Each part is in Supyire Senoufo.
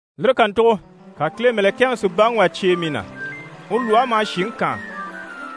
Lire kàntugo ka Kile mɛ̀lɛkɛŋi si baŋi wà cyêe mii na. Uru lwɔhe maha shìŋi kaan.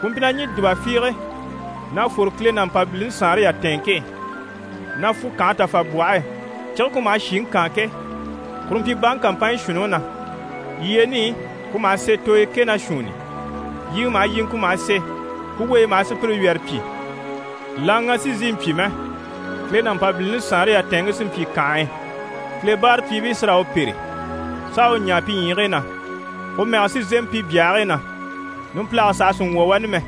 Ku mpyi na ɲî dùba fiige na fwore Kile ná Mpabilini saanre yatɛɛnŋke e, na fwu kànhe tafabwɔhe e. Cige ku maha shìŋi kaan ke, kuru mpyi baŋi kàmpanɲyi shuunniŋi na. Yyeeni i, ku maha se tooyo kɛ ná shuunni i. Yiŋɛ maha yiŋɛ, ku maha se, ku weyi maha sùpyire wyɛrɛ pyi. Laŋaga sì n‑sìi n‑pyi mɛ. Kile ná Mpabilini saanre yatɛɛnŋke sí n‑pyi kànhe e, Kile báarapyiibii sí raa u pêre, s'a u ɲaa pi ɲyiigii na, u mɛge sí n‑sémɛ pi byahigii na. Numpilage saha sì n‑wwɔ̀ wani mɛ.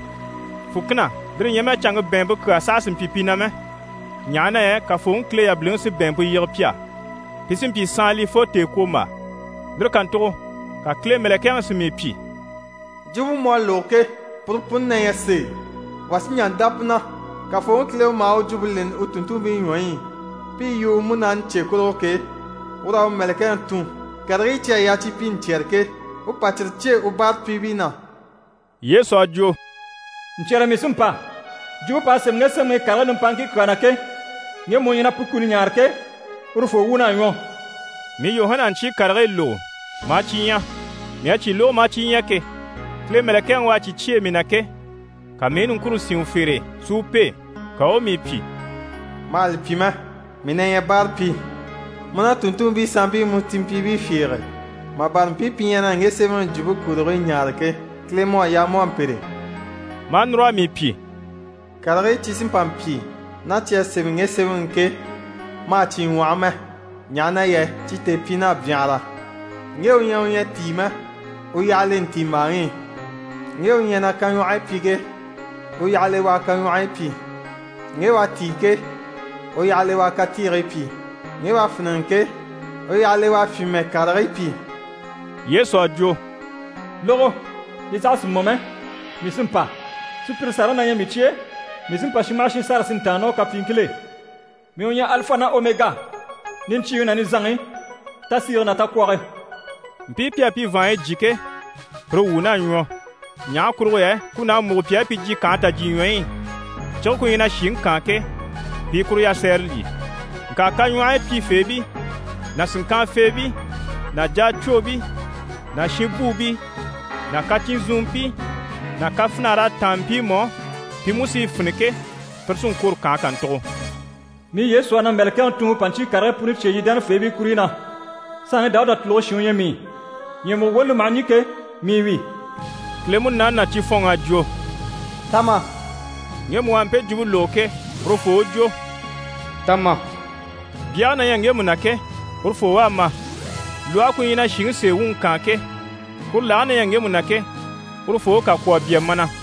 Fùkina, lire ɲyɛ mɛ canŋke bɛ̀ɛnmpe kyaa saha sì n-pyi pi na mɛ, ɲaha na yɛ Kafooŋi Kile yabiliŋi sí bɛ̀ɛnmpe yige pi á. Pi sí n‑pyi saanlii fo tèekwombaa. Lire kàntugo ka Kile mɛ̀lɛkɛŋi si mii pyi: «Jwumpe mu à lógo ke, puru puni na ɲyɛ sèe, wà sí n‑jà n‑dá pu na. Kafooŋi Kile u maha u jwumpe leni u tùnntunmpii ɲwɔyi i pi i yu u Munaani cye kurugo ke, ur'à u mɛ̀lɛkɛŋi tun, karigii cyi à yaa cyi pyi ɲcyɛ̀rɛ ke, u pa cyire cyêe u báarapyiibii na.» Yesu à jwo: «Ɲcyɛ̀rɛ mii sí n‑pa. Jwumpe p'à sémɛ ŋge sémɛŋi i karigii nimpaaŋkii kyaa na ke, ŋgemu u ɲyɛ na pu kuni ɲaare ke, urufoo wuun'à ɲwɔ.» Mii Yuhana à ɲcyii karigii lógo, maa cyi ɲya. Mii à cyi lógo maa cyi ɲya ke, Kile mɛ̀lɛkɛŋi u à cyi cyêe mii na ke, ka mii i niŋkure sín u fere e si u pêe. Ka u u mii pyi: «Ma hà li pyi mɛ! Mii na ɲyɛ báarapyi, mu ná tùnntunmpii sanmpii mu cìnmpyiibii fiige, mà bâra mpii pi ɲyɛ na ŋge sémɛŋi jwumpe kurigii ɲaare ke. Kile mu à yaa mu u a mpêre.» Maa núr'a mii pyi: «Karigii cyi sí n‑pa n‑pyi ná cyi à sémɛ ŋge sémɛŋi i ke, ma hà cyi ŋwɔhɔ mɛ, ɲaha na yɛ cyi tèepyiin'à byanhara. Ŋge u ɲyɛ u ɲyɛ à tíi mɛ, u yyaha le ntiimbaaŋi i, ŋge u ɲyɛ na kaɲwɔhɔyi pyi ke, u yyaha le u a kaɲwɔhɔyi pyi. Ŋge u à tíi ke, u yyaha le u a katiigii pyi, ŋge u à fíniŋɛ ke, u yyaha le u a fyìnmɛ karigii pyi.» Yesu à jwo: «Lógo, li saha sì mɔ mɛ, mii sí n‑pa. Sùpyire sàraŋi na ɲyɛ mii cye e, mii sí n‑pa shin maha shin sâra si ntàanna ná u kapyiiŋkil'e. Mii u ɲyɛ Alifa ná Omega, niɲcyiiŋi ná nizanŋi, tasiige ná takwɔge.» Mpii pi à pi vàanɲyi jyé ke, pire wuun'à ɲwɔ, ɲaha kurugo yɛ kun'à múgo pi á pi jyè kànhe tajyiɲwɔyi i, cige ku ɲyɛ na shìŋi kaan ke, pi i kuru yasɛɛre lyî. Ŋka kaɲwɔhɔyi pyifeebii ná sìnŋkanfeebii ná jacwoobii ná shinbuubii ná kacyinzunmpii ná kafinar'à táan mpiimu á pi mú si i fini ke, pire sí n-kwôro kànhe kàntugo. «Mii Yesu à na mɛ̀lɛkɛŋi tun u pa ɲcyii karigii puni cyêe yii dánafeebii kuruɲyi na. Saanŋi Dawuda tùluge shin u ɲyɛ mii. Ɲyɛ̀mugo woni li maha ɲî ke, mii wi.» Kile Munaani ná cifɔnŋ'à jwo: «Ta ma!» Ŋgemu u à mpe jwumpe lógo ke, urufoo u jwo: «Ta ma!» Byage na ɲyɛ ŋgemu na ke, urufoo u a ma. Lwɔhe ku ɲyɛ na shìŋi sèe wuŋi kaan ke, kuru lage na ɲyɛ ŋgemu na ke, urufoo u kà kwó a bya mana.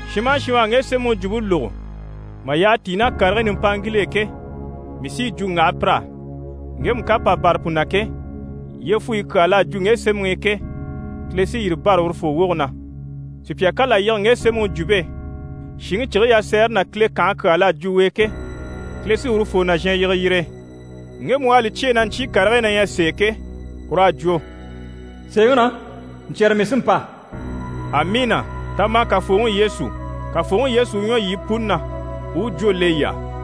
Shin maha shin u à ŋge sémɛŋi jwumpe lógo mà yyaha tíi ná karigii nimpaŋkil'e ke, mii sí yi jwo n‑waha pir'á, ŋgemu ká pà bâra pu na ke, yyefuyi kyaa l'à jwo ŋge sémɛŋi i ke, Kile sí yire bâra urufoo woge na. Sùpya ká là yige ŋge sémɛŋi jwumpe e, shìŋi cige yasɛɛre ná Kile kànhe kyaa l'à jwo u e ke, Kile sí urufoo nàzhan yige yire e. Ŋgemu u à li cyêe na ɲcyii karigii na ɲyɛ sèe ke, ur'à jwo: «Sèeŋi na, ɲcyɛ̀rɛ mii sí n‑pa.» Amiina! Ta ma, Kafooŋi Yesu. Kafooŋi Yesu u ɲwɔ yii puni na, u u jwó le yii á!